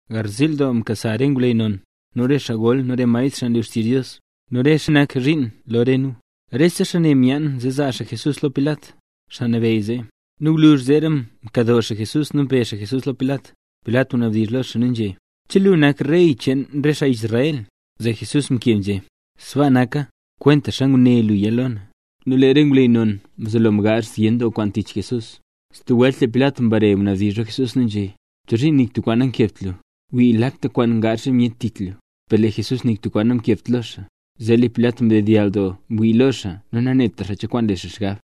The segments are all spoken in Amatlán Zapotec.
Garziil doo mkasa re ngwleyy non, nu re xaa gol, nu re maestr xaa nlu xtizh Dios, nu re xaa nak zhiin lo re nu. Rese xaa ne myaan zee zaa xaa Jesús lo Pilat, xaa nabeyy zee. Nu gwluzh zeera mkado xaa Jesús nu mbe xaa Jesús lo Pilat. —¿Che lu nak Rey cheen re xaa Israel? Zee Jesús mkeb nzhé: —Sbaa naka, kwentaxa nguné luya lo na. Nu lee re ngwleyy non mzelo mgaazh zyen doo kwaan tich Jesús. Stub welt lee Pilat mbare mnabdizh lo Jesús nu nzhé: —¿Chozhiin nik tub kwaan nankebt lu? ¡Wii, lakta kwaan ngaazh re myet tich lu! Per lee Jesús nik tub kwaan namkebt lo xaa. Zee lee Pilat mdedyall doo mwii lo xaa nu nanetra xaa cho kwaan le xaa xgab.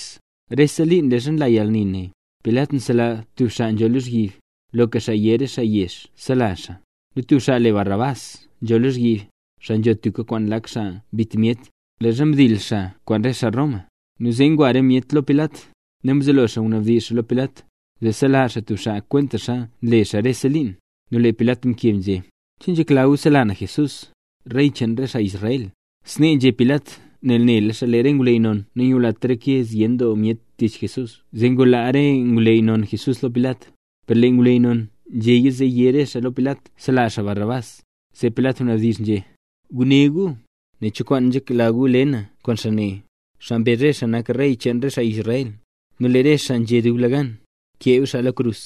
Rese liin leezha nla yalni ne, Pilat nsela tub xaa nzho lozhyib, loka xaa yé re xaa yezh sela xaa. Nu tub xaa le Barrabás nzho lozhyib, xaa nzho tubka kwaan lak xaa mbit myet, leezha mdil xaa kwaan re xaa Roma. Nu zee ngwa re myet lo Pilat, nu mzelo xaa ngunaab xaa lo Pilat, zee sela xaa tub xaa kwentaxa nle xaa rese liin. Nu lee Pilat mkeb nzhé: —¿Che nzhekla gu sela na Jesús, Rey cheen gu, xaa Israel? Snee nzhé Pilat nel nela xaa lee re ngwleyy non nangulat reke zyen doo myet tich Jesús zee ngulaa re ngwleyy non Jesús lo Pilat. Per lee re ngwleyy non nzhéya, zee yé re xaa lo Pilat sela xaa Barrabás. Zee Pilat mnabdizh nzhé: —Guné gu, nen cho kwaan nzhekla gu le na kwaan xaa ne, xaa mbezh re xaa nak Rey cheen gu. Nu lee re xaa nzhé dublegan: —¡Kee xaa lo krus!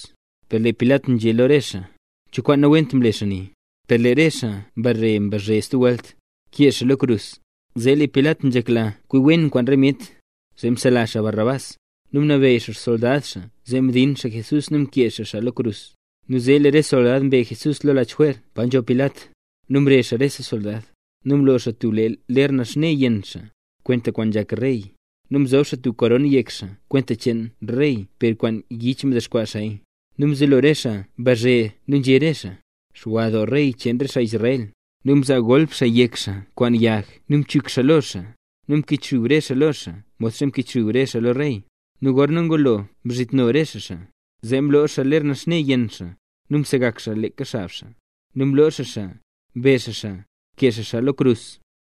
Per lee Pilat nzhé lo re xaa: —¿Cho kwaan nawent mle xaa ne? Per lee re xaa mbare nzhé stub welt: —¡Kee xaa lo krus! Zee lee Pilat nzhekla kwi wen kwaan re myet, zee msela xaa Barrabás, nu mnabeyy xaa xsoldad xaa zee mdin xaa Jesús nu kee xaa xaa lo krus. Nu zee lee re soldad mbe Jesús lo lach jwer pa nzho Pilat, nu mrezh xaa rese soldad. Nu mlo xaa tub ler naxne yenn xaa, kwenta kwaan nzhak rey. Nu mzob xaa tub koron yek xaa kwenta cheen rey, per kwaan yich mdexkwaa xaaya. Nu mzelo re xaa mbazhe nu nzhé re xaa: —¡Xwa doo Rey cheen re xaa Israel! Nu mzaa golp xaa yek xaa kwaan yag nu mchuk xaa lo xaa, nu mkichxub re xaa lo xaa modxa mkichxub re xaa lo rey. Nu gorna ngulo mzhitno re xaa xaa, zee mloo xaa ler naxne yenn xaa, nu msegak xaa xaa leeka xab xaa. Nu mloo xaa xaa, mbe xaa xaa, kee xaa xaa lo krus.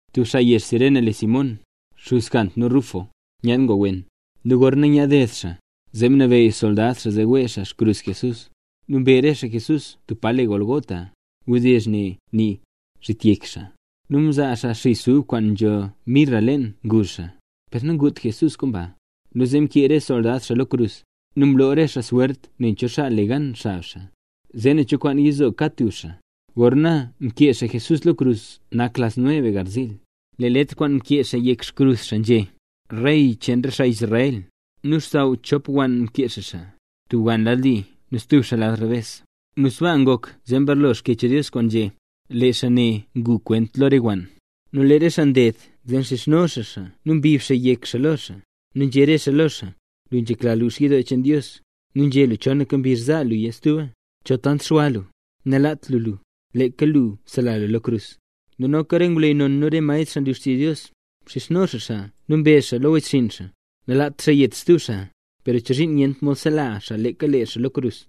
Tub xaa yezh Cirene le Simón, xuz Jant nu Rufo, nyaad ngwa wen. Nu gorna nyaad ded xaa, zee mnabeyy soldad xaa zee wee xaa xkrus Jesús. Nu mbe re xaa Jesús tub pa le Gólgota. (Wdizh ne nii: “Zhit Yek Xaa”.) Nu mzaa xaa xis ub kwaan nzho mirra leen ngu xaa, per nangut Jesús kwaan ba. Nu zee mkee re soldad xaa lo krus. Nu mloo re xaa swert nen cho xaa le gan xab xaa, zee nen cho kwaan yizo kad tub xaa. Gorna mkee xaa Jesús lo krus nak las nueve garziil. Lee letr kwaana mkee xaa yek xkrus xaa nzhé: “REY CHEEN RE XAA ISRAEL”. Nu xsaww chop wann mkee xaa xaa, tub wann lad li nu stub xaa lad rebes. Nu sbaa ngok zee mbarlo Xkyech Dios kwaana nzhé: “Lee xaa ne ngu kwent lo re wann”. Nu lee re xaa nded zee mxizhno xaa nu mbib xaa yek xaa lo xaa, nu nzhé re xaa lo xaa: —Lu nzhekla lux yidoo cheen Dios, nu nzhé lu chonaka mbizh za luya stuba. Chol tant xwa lu, nalaat lu lux lu, leeka lu sela lu lo krus. Nu noka re ngwleyy non nu re maestr, xaa nlu xtizh Dios, mxizhno xaa xaa nu mbezh xaa lo wechxinn xaa: —Nanlaat xaa nget stub xaa, per chozhiin nyent mod sela xaa leeka lee xaa lo krus.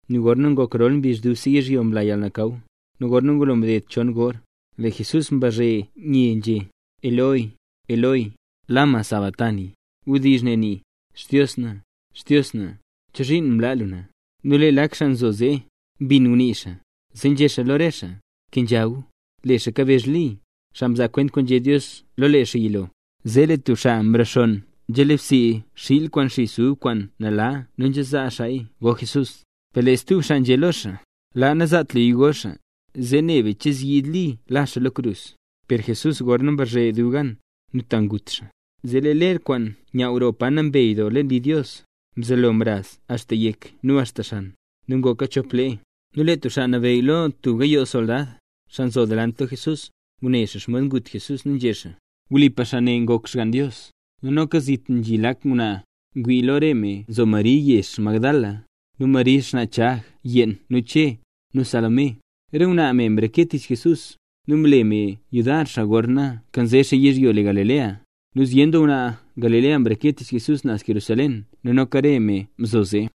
Nu gorna ngok rol mbizh, dubse yizhyo mla yalnakaw, nu gorna ngulo mded chon gor, lee Jesús mbazhe nye nzhé: —Eloi, Eloi, ¿lama sabaktani? (Wdizh ne nii: “Xdios na, Xdios na, ¿chozhiin mlaa lu na?”) Nu lee lak xaa nzo zee, mbin ngunii xaa, zee nzhé xaa lo re xaa: —Bkenzha gu. Lee xaa kabezh Li, xaa mzaa kwent kwaan nzhé Dios lo lee xaa yilo. Zee lee tub xaa mrexonn nzhale bsii xiil kwaan xis ub kwaan nala nu nzhazaa xaaya go Jesús. Per lee stub xaa nzhé lo xaa: —Laa, nazaat luya go xaa, zee ne be nen che zyiid Li la xaa lo krus. Per Jesús gorzee mbazhe dub gan, ta ngut xaa. Zee lee ler kwaan nyaaw roo Pa Nambey Doo leen yidoo, mzelo mraz axta yek nu axta xan, nu ngoka chop lee. Nu lee tub xaa nabeyy lo tub gayoo soldad, xaa nzo naz delant lo Jesús, ngune xaa xomod ngut Jesús nu nzhé xaa: —Wlipa, xaa ne ngok Xgann Dios. Nu noka zit nzhi lak ngwnaa ngwii. Lo re me nzo Mari me yezh Magdala, nu Mari xnaa Chag yeen nu Che, nu Salomé. Re ngwnaa ne mreke tich Jesús, nu mle re me yudar xaa gorna mkanze xaa yizhyo le Galilea. Nu zyen doo ngwnaa Galilea mreke tich Jesús naz Jerusalén nu noka re me nzo zee.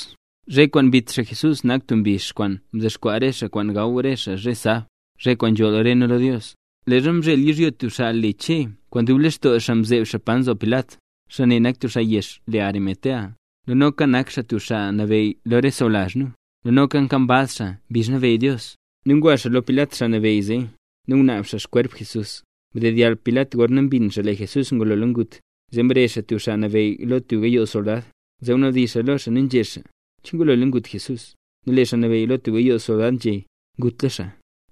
Zhe kwaan mbit xaa Jesús nak tub mbizh kwaan ndexkwaa re nu kwaan gaw nu zhe sab, zhe kwaan nzholl re nu lo Dios. Leezha mzhel yizhyo tub xaa le Che kwaan dub lextoo xaa mzeeb xaa pa nzo Pilat. Xaa ne nak tub xaa yezh le Arimatea, nu noka nak xaa tub xaa nabeyy lo re sawlazh nu, nu noka nkambaz xaa mbizh nabeyy Dios. Nu ngwa xaa lo Pilat xaa nabeyy zee, nu ngunaab xaa xkwerp Jesús. Mdedyall Pilat gorna mbin xaa lee Jesús ngulola ngut. Zee mrezh xaa tub xaa nabeyy lo tub gayoo soldad, zee mnabdizh xaa lo xaa, nu nzhé xaa: —¿Che ngulola ngut Jesús? Nu lee xaa nabeyy lo tub gayoo soldad nzhé: —Ngutla xaa.